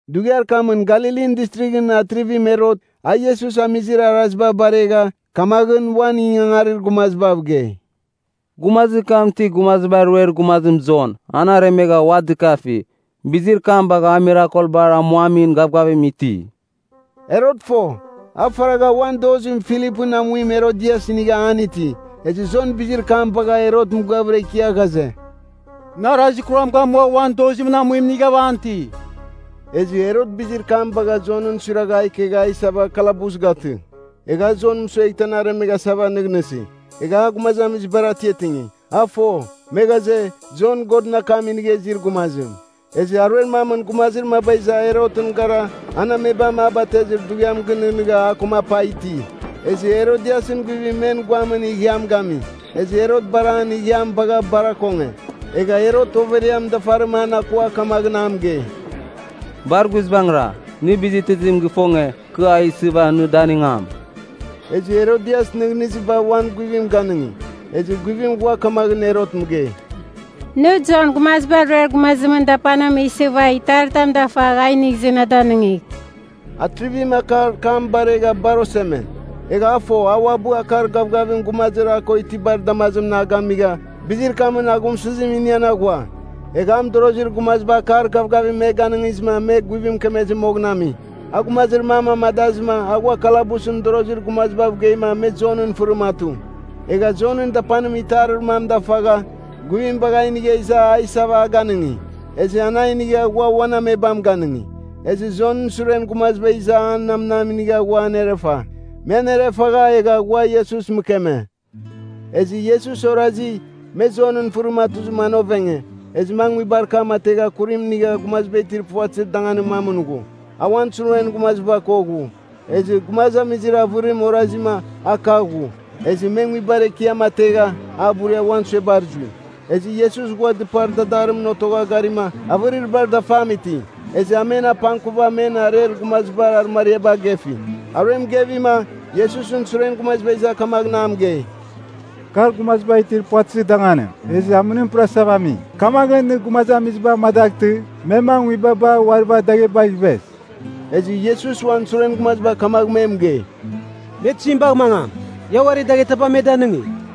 Dughiar kamɨn Galilin Distrighɨn Atrivim Herot, a Iesus amizir araziba baregha, kamaghɨn uan ingangarir gumazibav gei, “Gumazir kam ti, Gumaziba Ruer Gumazim Jon, an aremegha ua dɨkafi. Bizir kam bagha a mirakelbar amuamin gavgavim iti.” Herot fo, a faragha uan dozimɨn Filipɨn amuim Herodias inigha an iti. Ezɨ Jon bizir kam bagha Herot mɨgɨavɨra ikia ghaze, “Nɨ arazir kuram gamua uan dozimɨn amuim inigha an iti.” Ezɨ Herot bizir kam bagha Jonɨn suiragha a ikegha a isava kalabus gatɨ. Egha a Jon mɨsueghtɨ an aremeghasava nɨghnɨsi. Egha a gumazamizibar atiatingi. A fo, me ghaze, Jon Godɨn akam inigha izir gumazim. Ezɨ aruer mamɨn gumazir maba iza Herotɨn gara, an amebam a batezir dughiam gɨnɨghnɨgha, a koma apa iti. Ezɨ Herodiasɨn guivim men guamɨn ighiam gami. Ezɨ Herot bar an ighiam bagha bar akonge. Egha Herot overiam dafarim an akua kamaghɨn a mɨgei, “Bar guizbangɨra, nɨ bizitizim gifonge, kɨ a isɨva nɨ danɨngam.” Ezɨ Herodias nɨghnɨziba uan guivim ganɨngi, ezɨ guivim ghua kamaghɨn Herot mɨgei, “Nɨ Jon, Gumaziba Ruer Gumazimɨn dapanim isɨva itaritam dafagh a inigh izɨ na danɨngigh.” Atrivim akar kam baregha bar oseme. Egha a fo, a uabɨ akar gavgavim gumazir a ko itibar damazimɨn a gamigha, bizir kamɨn aghumsɨzim inian aghua. Egha a mɨdorozir gumaziba akar gavgavim me ganɨngizɨma me guivim mɨkemezir moghɨn ami. A gumazir mam amadazɨma, a ghua kalabusɨn mɨdorozir gumazibav geima, me Jonɨn fɨrim atu. Egha Jonɨn dapanim itarir mam dafagha, guivim bagha a inigha iza a isava a ganɨngi. Ezɨ an a inigha ghua uan amebam ganɨngi. Ezɨ Jonɨn suren gumaziba iza an namnam inigha ghua anerefa. Me anerefagha egha ghua Iesus mɨkeme. Ezɨ Iesus orazi, me Jonɨn fɨrim atuzɨma an ovenge, ezɨma a nguibar kam ategha kurim inigha gumaziba itir puvatɨzir danganir mamɨn ghu. A uan suren gumaziba ko ghu. Ezɨ gumazamizir avɨrim orazima, a kagh ghu. Ezɨ me nguibar ekiam ategha, a buria uan suebar zui. Ezɨ Iesus ghua dɨpar dadarimɨn otogha garima, avɨrir bar dafam iti. Ezɨ a men apangkuva men areir gumazibar arɨmariaba agefi. Aruem gevima, Iesusɨn suren gumaziba iza kamaghɨn a mɨgei, “Kar gumaziba itir puvatɨzir danganim, ezɨ amɨnim pɨrasava ami. Kamaghɨn nɨ gumazamiziba amadaghtɨ, me mangɨ nguibabar uari bagh daghebagh ivez.” Ezɨ Iesus uan suren gumaziba kamagh me mɨgei, “Me tizim bagh mangam? Ia uari daghetaba me danɨngigh.”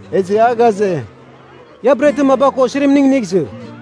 Ezɨ a ghaze, “Ia bretɨn maba ko osirimning inigh izɨ.”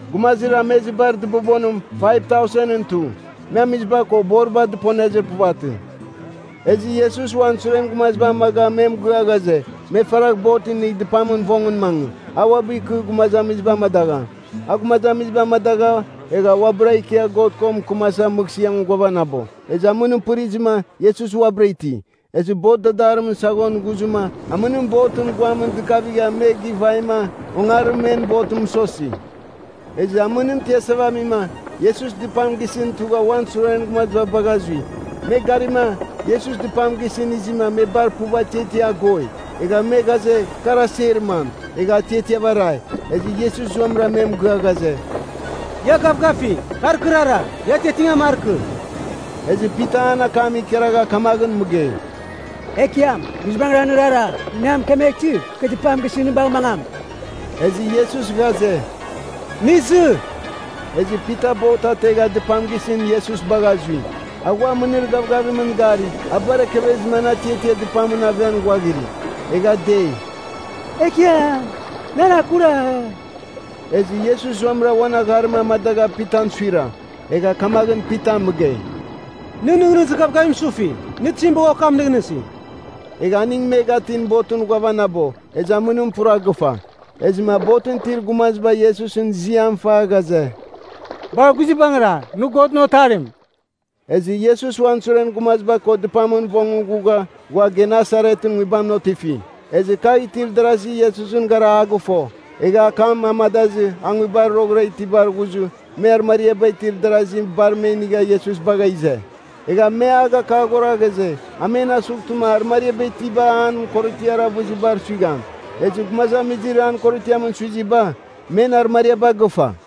Gumazir amezibar dɨbobonim 5,000ɨn tu. Me amiziba ko boriba dɨponezir puvatɨ. Ezɨ Iesus uan suren gumaziba amaga me mɨgɨa ghaze, me faragh bot inigh dɨpamɨn vongɨn mangɨ. A uabɨ ikɨ gumazamiziba amadagham. A gumazamiziba amadagha, egha uabɨra ikia God ko mɨkɨmasa mɨghsɨamɨn ghuavanabo. Ezɨ amɨnim pɨrizɨma, Iesus uabɨra iti. Ezɨ bot dadarimɨn saghon ghuzɨma, amɨnim botɨn guamɨn dɨkavigha me gɨvaima ongarim men botɨn mɨsosi. Ezɨ amɨnim tiasasava amima, Iesus dɨpam gisɨn tugha uan suren gumaziba bagha zui. Me garima, Iesus dɨpam gisɨn izima, me bar puv atiatiava agoi. Egha me ghaze, kar aser mam. Egha atiatiava arai. Ezɨ Iesus zuamɨra me mɨgɨa ghaze, “Ia gavgafigh, kar kɨrara. Ia atiatingan markɨ!” Ezɨ Pita an akam ikaragha kamaghɨn mɨgei, “Ekiam, guizbangɨra nɨrara, nɨ na mɨkemeghtɨ, kɨ dɨpam gisɨn nɨ bagh mangam.” Ezɨ Iesus ghaze, “Nɨ izɨ.” Ezɨ Pita bot ategha dɨpam gisɨn Iesus bagha zui. A ghua amɨnir gavgavimɨn gari, a bar ekevezɨma an atiatia dɨpamɨn aven ghuaghiri. Egha dei, “Ekiam, nɨ nan akuragh!” Ezɨ Iesus zuamɨra uan agharim amadagha Pitan suira. Egha kamaghɨn Pitan mɨgei, “Nɨn nɨghnɨzir gavgavim sufi. Nɨ tizim bagha okam nɨghnɨsi?” Egha aning me gatɨn botɨn ghuavanabo, ezɨ amɨnim pura gɨfa. Ezɨma botɨn itir gumaziba Iesusɨn ziam fa ghaze, “Bar guizbangɨra, nɨ Godɨn Otarim!” Ezɨ Iesus uan suren gumaziba ko dɨpamɨn vongɨn ghugha, ghua Genesaretɨn nguibamɨn otifi. Ezɨ kagh itir darazi Iesusɨn gara a gɨfo. Egha akam amadazɨ, a nguibar roghɨra itibar ghuzɨ, me arɨmariaba itir darazi bar me inigha Iesus bagha ize. Egha me a gakaghora ghaze, a men asughtɨma, arɨmariaba itiba an korotiar avɨzibar suigham. Ezɨ gumazamizir an korotiam suiziba, men arɨmariaba gɨfa.